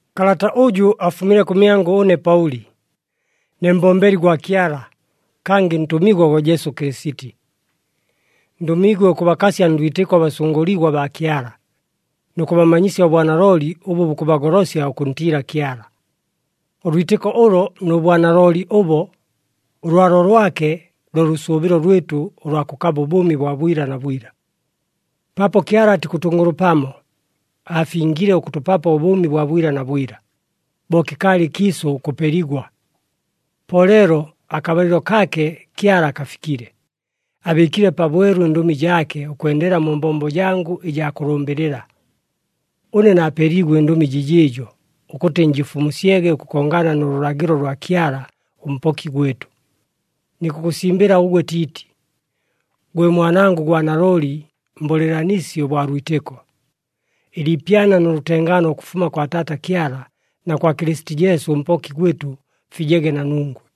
Kalata ʉjʉ afumile kʉmyangʉ ʉne Paʉli, ne mbombeli gwa Kyala, kangɨ ntʉmigwa gwa Jesu Kɨlɨsiti. Ndʉmiigwe ʉkʉbakasya ndwitɨko abasʉngʉligwa baa Kyala, nʉ kʉbamanyisya ʉbwanalooli ʉbʉ bukʉbagolosya ʉkʉntiila Kyala. Ʉlwitɨko ʉlo nʉ bwanalooli ʉbo, ʉlwalo lwake lo lʉsʉʉbɨlo lwɨtʉ ʉlwa kʉkaba ʉbʉʉmi bwa bwila na bwila. Paapo Kyala atikʉtʉngʉlʉpamo, aafingile ʉkʉtʉpapo ʉbʉʉmi bwa bwila na bwila, bo kɨkaalɨ ɨkiisʉ ʉkʉpeligwa. Po leelo akabalɨlo kaake Kyala kafikile, abɨɨkile pabwelu ɨndʉmi jaake, ʉkwendela mu mbombo jangʉ ɨjaa kʉlʉmbɨlɨla. Ʉne naapeeliigwe ɨndʉmi jɨjɨɨjo, ʉkʉtɨ njɨfumusyege ʉkʉkongana nʉ lʉlagɨlo lwa Kyala ʉMpoki gwɨtʉ. Nikʉkʉsimbɨla ʉgwe Tiiti, gwe mwanangʉ gwa nalooli mbʉlɨɨlanisi ʉbwa lwitɨko. Ɨliipyana nʉ lʉtengaano ʉkʉfuma kwa Taata Kyala na kwa Kɨlɨsiti Jesu ʉMpoki gwɨtʉ, fijege na nungwe.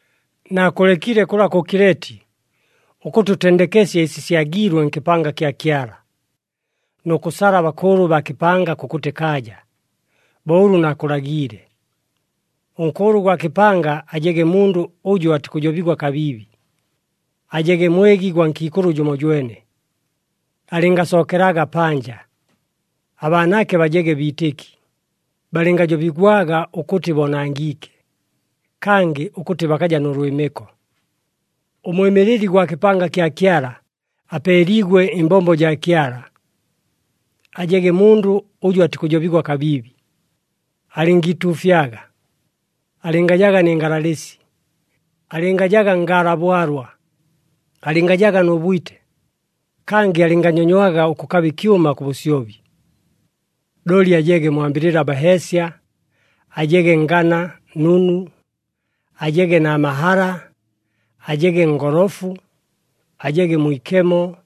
Naakʉlekile kʉla kʉ Kileti, ʉkʉtɨ ʉtendekesye ɨsi syagiilwe nkɨpanga kya Kyala, nʉ kʉsala abakʉʉlʉ baa kɨpanga kʉkʉtɨ kaaja, bo ʉlʉ naakʉlagiile. Ʉnkʉʉlʉ gwa kɨpanga ajege mundʉ ʉjʉ atikʉjobigwa kabiibi, ajege mwegi gwa nkiikʉlʉ jʉmojwene, alɨngasookelaga panja. Abaanaake bajege biitɨki, balɨngajobigwaga ʉkʉtɨ boonangiike, kangɨ ʉkʉtɨ bakaja nʉ lwɨmɨko. Ʉmwɨmɨlɨli gwa kɨpanga kya Kyala apeeliigwe ɨmbombo jaa Kyala, ajege mundʉ ʉjʉ atikʉjobigwa kabiibi. Alɨngiituufyaga, alɨngajaga nɨ ngalalɨsi, alɨngajaga ngaala bwalwa, alɨngajaga nʉ bwite, kangɨ alɨnganyonywaga ʉkʉkaba ɨkyʉma kʉ bʉsyobi. Looli ajege mwambɨlɨla baheesya, ajege ngana nunu, ajege na mahala, ajege ngolofu, ajege mwikemo,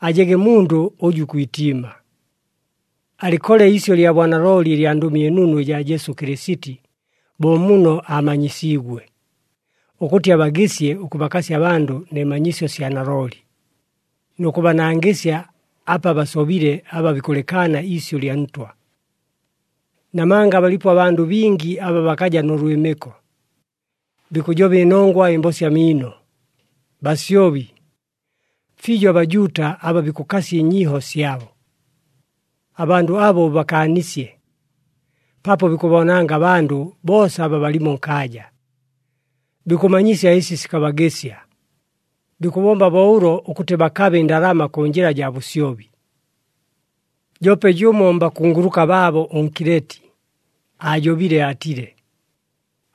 ajege mundʉ ʉjʉ ikwitiima. Alɨkole iisyʉ lya bwanalooli ɨlya Ndʉmi ɨNunu ɨjaa Jesu Kɨlɨsiti, bo muno aamanyisiigwe, ʉkʉtɨ abagɨsye ʉkʉbakasya abandʉ nɨ manyisyo sya nalooli, nʉ kʉbanangɨsya apa basobile aba bikʉlɨkaana iisyʉ lya Ntwa. Namanga balipo abandʉ bingi aba bakaja nʉ lwɨmɨko, bikʉjoba ɨnongwa ɨmbosya miino, basyobi, fiijo aBajuuta aba bikʉkasya ɨnyiiho syabo. Abandʉ abo ʉbakaanisye, paapo bikʉboonanga abandʉ boosa aba balimo nkaaja, bikʉmanyisya ɨsi sikabagɨsya. Bikʉbomba bo ʉlo ʉkʉtɨ bakabe ɨndalama kʉ njɨla jaa bʉsyobi. Joope jʉmo mbakunguluka baabo ʉNkileti, aajobile aatile,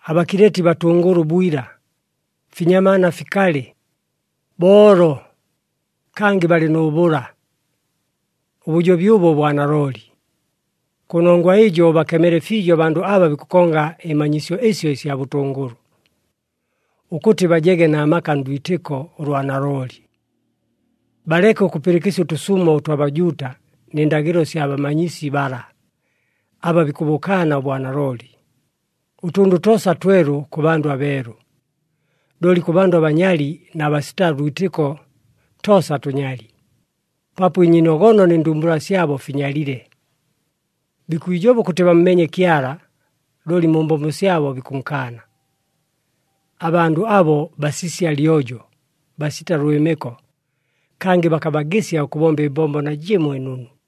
“ABakileti batʉngʉlʉ bwila, finyamaana fikalɨ, boolo, kangɨ balɨ nʉ bʉla.” Ʉbʉjobi ʉbo bwa nalooli. Kʉnongwa ɨjo ʉbakemele fiijo abandʉ aba bikʉkonga ɨmanyisyo ɨsyo ɨsya bʉtʉngʉlʉ, ʉkʉtɨ bajege na maka ndwitɨko ʉlwa nalooli. Baleke ʉkʉpɨlɨkɨsya ʉtʉsumo ʉtwa Bajuuta nɨ ndagɨlo sya bamanyisi bala, aba bikʉbʉkaana ʉbwanalooli. Ʉtʉndʉ toosa twelu kʉ bandʉ abeelu. Looli kʉ bandʉ abanyali na basita lwitɨko, toosa tʉnyali, paapo ɨnyiinogono nɨ ndumbula syabo finyalile. Bikwijoba ʉkʉtɨ bammeenye Kyala, looli mu mbombo syabo bikʉnkaana. Abandʉ abo basisya lyojo, basita lwɨmɨko, kangɨ bakabagɨsya ʉkʉbomba ɨmbombo najɨmo ɨnunu.